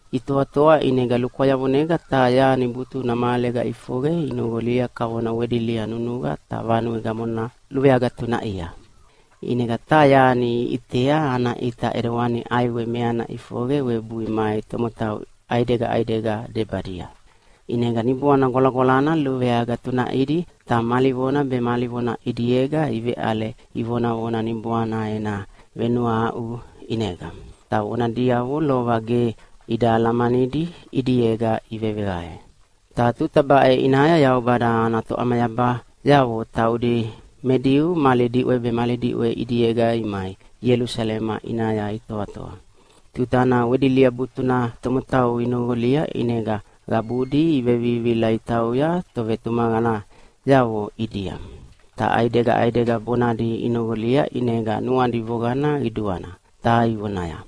Itoatoa ʼinega lukwayavonega taha yani butuna mahalega ʼifoqe inoqolia kavona wedilia nunuqa ta vanue gamona luveagatunaʼia. ʼInega taha yani iʼitea ana ʼita ʼidewani ʼaiwe meana ʼifoqe webui mai tomotau ʼaidega ʼaidega debadia. ʼInega Niboana Gwalagwalana luveagatunaʼidi ta mali vona be mali vona ʼidiega iveʼale ivonavona Niboana ena venuahaʼu ʼinega. Ta vona diavona lova ge ida alamanidi ʼidiega iveveqae. Ta tuta baʼe ʼinaya Yaubada ana toʼamayabayavo taudi me Diu mali diʼwe be mali diʼwe ʼidiega imai Ielusalema ʼinaya itoatoa. Tutana wedilia butuna tomotau inoqolia ʼinega qabudi ivevivihila itauya tovetumaqanayavo ʼidia. Ta ʼaidega ʼaidega bonadi inoqolia ʼinega nuadi voqana qiduana, ta ivonaya,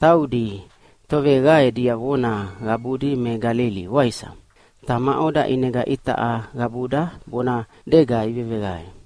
“Taudi toveqae diavona qabudi me Galili, waisa? Ta maʼoda ʼinega itaʼa qabuda bonadega iveveqae?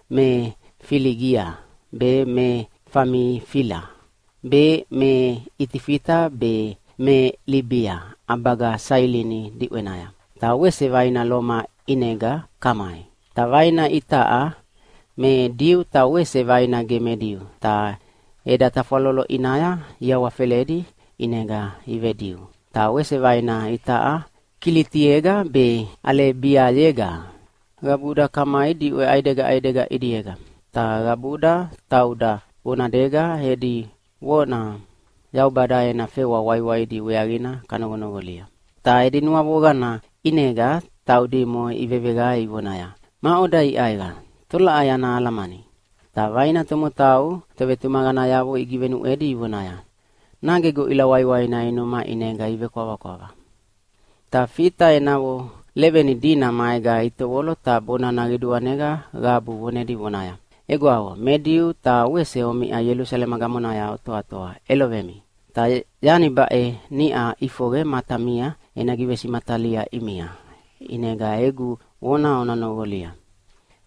me Filigia be, me Famifila be, me Itifita be, me Libia ʼabaga Sailini diʼwenaya, ta wese vaina Loma ʼinega kamai. Ta vaina itaʼa me Diu ta wese vaina ge me Diu, ta eda tafwalolo ʼinaya iawafeledi ʼinega ive-Diu. Ta wese vaina itaʼa Kilitiega be Aleibiayega. Qabuda kamai diʼwe ʼaidega ʼaidega ʼidiega, ta qabuda tauda bonadega edi vona Yaubada ena fewa waiwaidi weaqina kanoqonoqolia!” Ta edi nuavoqana ʼinega taudimo iveveqae ivonaya, “Maʼoda iʼaiqa? Tolaʼai ana alamani?” Ta vaina tomotau tovetumaqanayavo igivenuʼwedi ivonaya, “Nage goʼila waiwaina inuma ʼinega ivekwavakwava.” Ta Fita enavo leveni dina maega itovolo ta bonana qiduanega qabu vonedi vonaya, “Egwavo me Diu ta wese omiʼa Ielusalema gamonaya otoatoa, ʼelovemi! Ta yani baʼe niʼa ʼifoqe matamia ena givesimatalia ʼimia, ʼinega egu vona ona noqolia.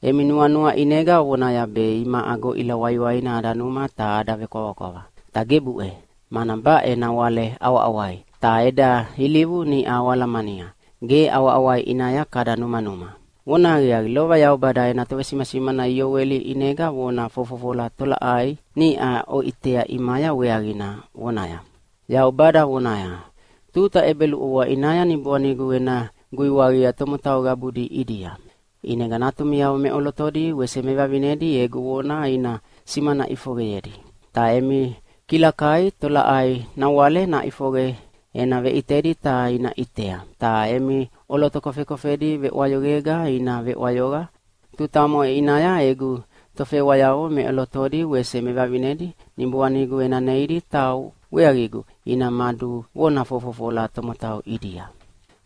Emi nuanua ʼinega ovonaya be imaʼa goʼila waiwaina ada numa ta ada vekwavakwava. Ta gebuʼe, mana baʼe nawale ʼawaʼawai. Ta eda ilivu niʼa oalamania, ge ʼawaʼawai ʼinaya kada numanuma. Vonahaqiaqi, lova Yaubada ena tovesimasimana Ioeli ʼinega vona fofofola tolaʼai niʼa oʼitea ʼimaya weaqina, vonaya, ‘Yaubada vonaya, Tuta ʼebeluʼovoa ʼinaya Niboanigu ena guiwaqia tomotau qabudi ʼidia. ʼInega natumiavo meʼolotodi wese mevavinedi egu vona ina simana ʼifoqeyedi. Ta emi kilakai tolaʼai nawale naʼifoqe ena veʼitedi ta ina ʼitea, ta emi ʼoloto kofekofedi veʼwayoqega ina veʼwayoqa. Tuta omoʼe ʼinaya egu tofewayavo meʼolotodi wese mevavinedi Niboanigu ena neidi ta weaqigu ina maduvona fofofola tomotau ʼidia.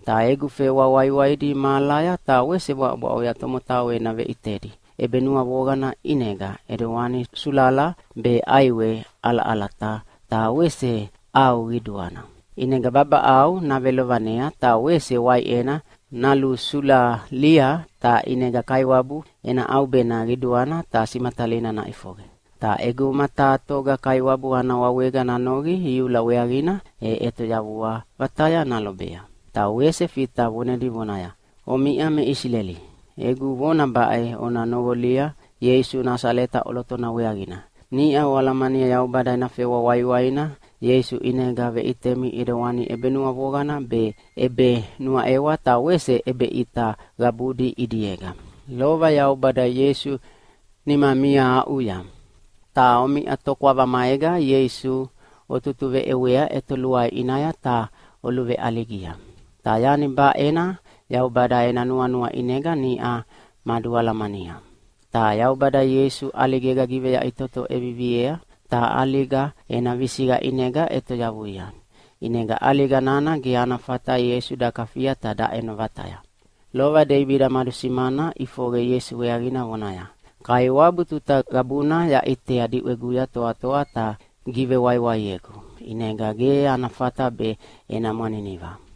Ta egu fewa waiwaidi mahalaya ta wese bwaʼobwaʼoya tomotau ena veʼitedi ʼebenuavoqana ʼinega, ʼidewana sulala be ʼaiwe ʼalaʼalata ta wese ʼau qiduana. ʼInega babaʼau navelovanea, ta wese waiʼena nalusulalia. Ta ʼinega Kaiwabu ena ʼaubena qiduana ta simatalina naʼifoqe. Ta ʼeguma taha toga Kaiwabu ana wawega nanoqi iula weaqina e ʼetoyavua vataya nalobea.’” Ta wese Fita vonedi vonaya, “Omiʼa me Isileli, egu vona baʼe ona noqolia Ieisu Nasaleta ʼolotona weaqina. Niʼa oalamania Yaubada ena fewa waiwaina Ieisu ʼinega veʼitemi ʼidewana ʼebenuavoqana be ʼebenuaʼewa ta wese ʼebeʼita qabudi ʼidiega. Lova Yaubada Ieisu nimamia aʼuya. Ta omiʼa tokwava maega Ieisu otutuveʼewea ʼetoluai ʼinaya ta oluveʼaligia. Ta yani baʼena Yaubada ena nuanua ʼinega niʼa madualamania. Ta Yaubada Ieisu ʼaligega giveyaʼitoto ʼeviviea, ta ʼaliga ena visiqa ʼinega ʼetoyavuia. ʼInega ʼaliga nana ge ana fata Ieisu dakafia ta daʼeno vataya. Lova Deibida madusimana ʼifoqe Ieisu weaqina vonaya, ‘Kaiwabu tuta qabuna yaʼitea diʼweguya toatoa ta givewaiwaiegu, ʼinega ge ana fata be ena mwaniniva.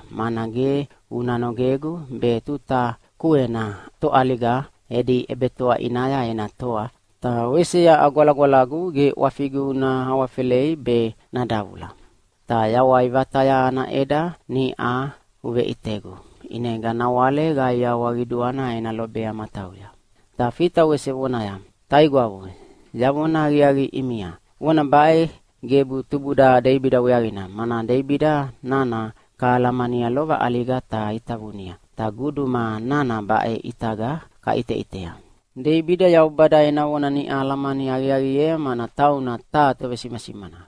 mana ge una nogegu be tuta kuena toʼaliga edi ʼebetoa ʼinaya ena toa, ta wese yaʼa Gwalagwalagu ge ʼwafigu una awafelei be nadavula. Ta yawai vataya ana ʼeda niʼa uveʼitegu, ʼinega nawale qaiawa qiduana ena lobea matauya.’” Ta Fita wese vonaya, “Taigwavo, yavona aqiaqi ʼimia, vona baʼe gebu tubuda Deibida weaqina, mana Deibida nana kahalamania lova ʼaliga ta itavunia. Ta guduma nana baʼe ʼitaga kaʼiteʼitea. Deibida Yaubada ena vona niʼa alamani aqiaqiea mana tauna taha tovesimasimana.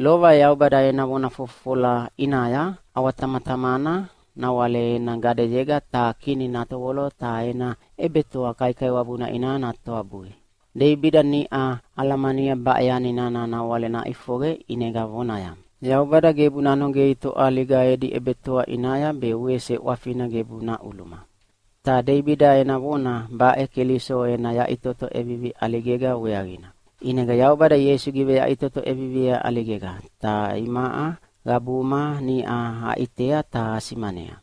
Lova Yaubada ena vona fofofola ʼinaya ʼawatamatamana nawale ena gadeyega taha Kini natovolo ta ena ʼebetoa kaikaiwabuna ʼinaya natoabui. Deibida niʼa alamania baʼe yani nana nawale naʼifoqe, ʼinega vonaya, ‘Yaubada gebu nanogei toʼaliga edi ʼebetoa ʼinaya be wese ʼwafina gebu naʼuluma.’ Ta Deibida ena vona baʼe Keliso ena yaʼitoto ʼevivi ʼaligega weaqina. ʼInega Yaubada Ieisu giveyaʼitoto ʼeviviea ʼaligega, ta imaʼa qabuma niʼa aʼitea ta asimanea.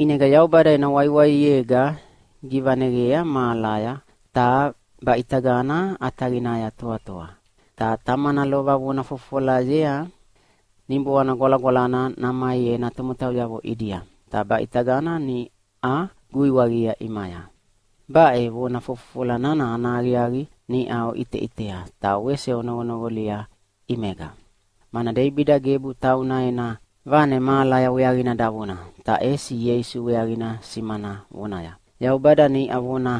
ʼInega Yaubada ena waiwaiega givaneqea mahalaya ta baʼitagana ʼataqinaya toatoa. Ta Tamana lova vona fofofolayea Niboana Gwalagwalana namai ena tomotauyavo ʼidia, ta baʼitagana niʼa guiwaqia ʼimaya. Baʼe vona fofofola nana ana aqiaqi niʼa oʼiteʼitea ta wese onoqonoqolia ʼimega. Mana Deibida gebu tauna ena vane mahalaya weaqina davona, ta ʼesi Ieisu weaqina simana vonaya, ‘Yaubada niʼa vona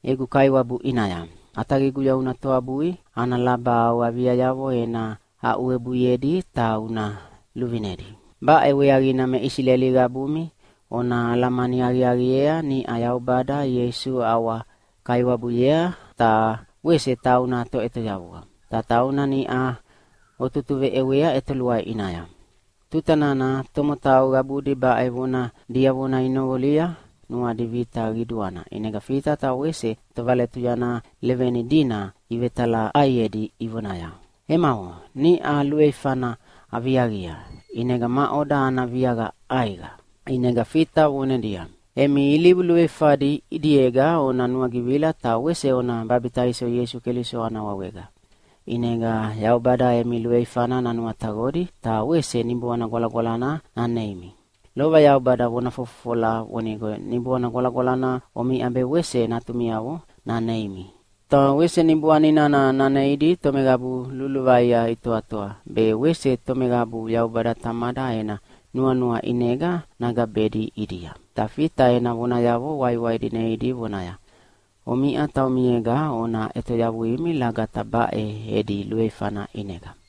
egu Kaiwabu ʼinaya, ʼAtaqiguya una toabui ana laba au aviayavo ena aʼuwebuiedi ta una luvinedi.’ “Baʼe weaqina me Isileli qabumi ona alamani aqiaqiea niʼa Yaubada Ieisu ʼawa-Kaiwabuyea ta wese tauna Toʼetoyavua. Ta tauna niʼa otutuveʼewea ʼetoluai ʼinaya.” Tuta nana tomotau qabudi baʼe vona diavona inoqolia nuadi vita qiduana, ʼinega Fita ta wese tovaletuyana leveni dina ivetalaʼaiedi ivonaya, “Emavo, niʼa luveifana aviaqia, ʼinega maʼoda ana viaqa ʼaiqa?” ʼInega Fita vonedia, “Emi ilivu luveifadi ʼidiega ona nuagivila, ta wese ona babitaiso Ieisu Keliso ana wawega. ʼInega Yaubada emi luveifana nanuataqodi, ta wese Niboana Gwalagwalana naneimi. Lova Yaubada vona fofofola vonigo Niboana Gwalagwalana omiʼa be wese natumiavo naneimi. Ta wese Niboani nana naneidi tomeqabu luluvaia itoatoa, be wese tomeqabu Yaubada Tamada ena nuanua ʼinega nagabedi ʼidia.” Ta Fita ena vonayavo waiwaidi neidi vonaya, “Omiʼa taumiega ona ʼetoyavuimi lagata baʼe edi luveifana ʼinega!”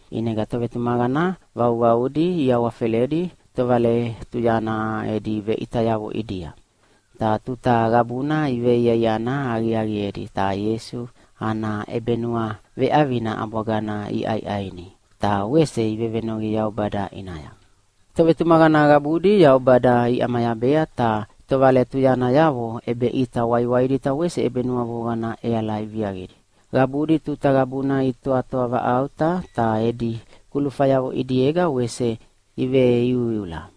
ʼInega tovetumaqana vauvaudi iawafeledi tovaletuyana edi veʼitayavo ʼidia. Ta tuta qabuna iveiaiana aqiaqiedi ta Ieisu ana ʼebenuaveʼavina ʼabwagana iʼaiʼaini ta wese ivevenoqi Yaubada ʼinaya. Tovetumaqana qabudi Yaubada iʼamayabea ta tovaletuyanayavo ʼebeʼita waiwaidi ta wese ʼebenuavoqana ʼeala iviaqidi. Qabudi tuta qabuna itoavaʼauta, ta edi kulufayavo ʼidiega wese iveiuiula.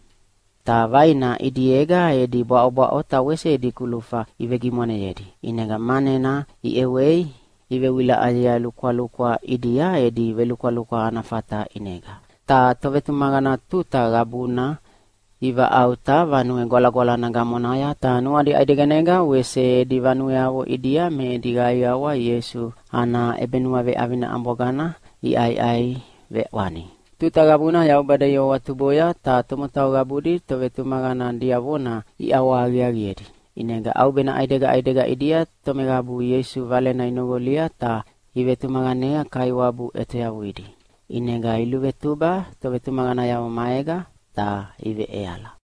Ta vaina ʼidiega edi bwaʼobwaʼo ta wese edi kulufa ivegimwaneyedi. ʼInega manena iʼewei ivewilaʼayea lukwalukwa ʼidia edi velukwalukwa ana fata ʼinega. Ta tovetumaqana tuta qabuna ivaʼauta Vanue Gwalagwalana gamonaya. Ta nuadi ʼaideganega wese edi vanueavo ʼidia me edi qaiawa Ieisu ana ʼebenuaveʼavina ʼabwagana iʼaiʼai veʼwani. Tuta qabuna Yaubada iawahawatuboya ta tomotau qabudi tovetumaqana diavona iʼawahaqiaqiedi. ʼInega ʼaubena ʼaidega ʼaidega ʼidia tomeqabu Ieisu Valena inoqolia ta ivetumaqanea Kaiwabu ʼetoyavuidi. ʼInega iluvetuba tovetumaqanayavo maega ta iveʼeala.